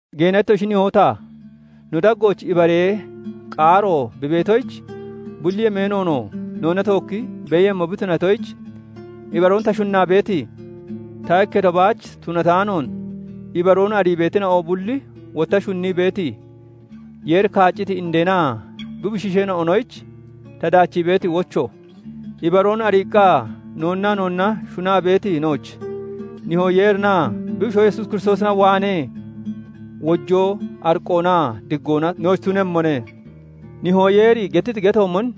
Geena ittoshi nihoo ta, no daggooch ibaree qaaro bi beetoyich, bulli yemeenoonoo noonna tookki beeyemmo bi tunatoyich, ibaroon ta shunnaa beeti, ta ikketo baach tunataanoon ibaroon arii beetina'o bulli wotta shunnii beeti, Yeeri kaacciti indeenaa bi bushiisheena'onoyich ta daachii beeti wocho. Ibaroon ariiqqa noonnaa noonna shunaa beeti nooch, Nihoo Yeerinaa bi Bushoo Yesuus Kiristoosina waanee wojoo, ariqqoonaa diggoona nooch tunemmone. Nihoo Yeeri gettiti getoomon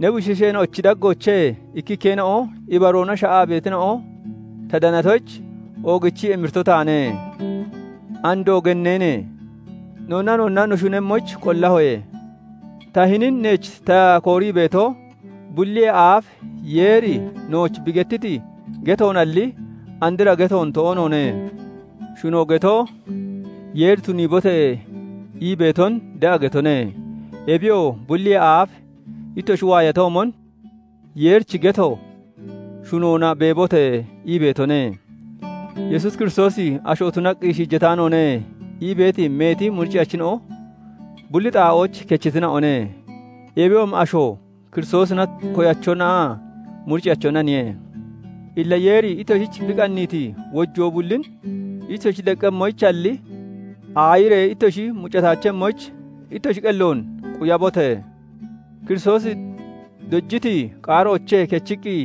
ne bushiisheena'ochi daggoochee ikkikkeena'o ibaroona sha'aa beetina'on ta danatoyich, oogichii emirito taane. Andoo genneene! Noonnaa noonna no shunemmoyich qollahoye. Ta hinin neech ta koorii beeto, bulliyee aaf Yeeri nooch bi gettiti getoonalli, andra getoon toonoone. Shuno geto, Yeeri "Tuniibote!" ii beeton de'a getone. Ebiyoo bulliyee aaf ittoshi waayatoomon, Yeerichi geto "Shunoona beebote!" ii beetone. "Yesuus Kiristoosi asho tunaqqi shiijataanoone" ii beeti meeti muricciyachina'o bulli xaa'ooch kechitina'one. Ebiyoomi asho Kiristoosina koyachonaa muricciyachonaniye. Illa Yeeri ittoshich bi qanniiti wojoo bullin ittoshi deqqemmoyichalli, aayiree ittoshi muccataachemmoyich ittoshi qelloon quyabote! Kiristoosi dojiti qaaroochee kechiqqi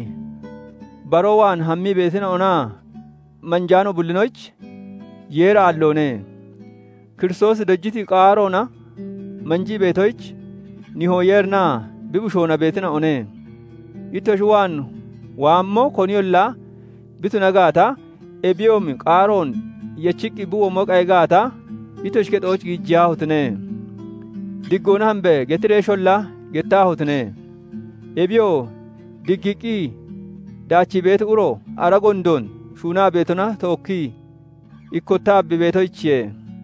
baroo waan hammii beetonaa manjaano bullinoyich Yeeri aalloone; Kiristoosi dojiti qaaroona manjii beetoyich Nihoo Yeerinaa bi Bushoona beetina'one. Ittoshi waan waammo koniyolla bi tuna gaata, ebiyoomi qaaroon yechiqqi bi womo qayi gaata, ittoshi kexooch giijiyaahotine! "Diggoona hambe!" getireesholla gettaahotine! Ebiyoo, diggiiqqi daachii beeti uro ara gondoon shuunaa beetona tookkii ikkottaa bi beetoyichiye.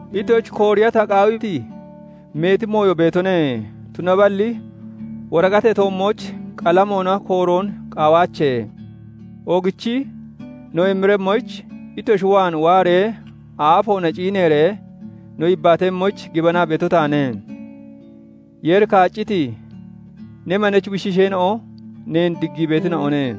Ittoshich kooriya ta qaawiti meeti mooyo beetone; tunaballi woriqatee toommooch qalamoona kooroon qaawaache. Oogichi no emiremmoyich, ittoshi waan waaree aafoona ciineeree no yibbaatemmoyich gibanaa beeto taane. Yeeri kaacciti ne manechi bushiisheena'o neen diggii beetina'one.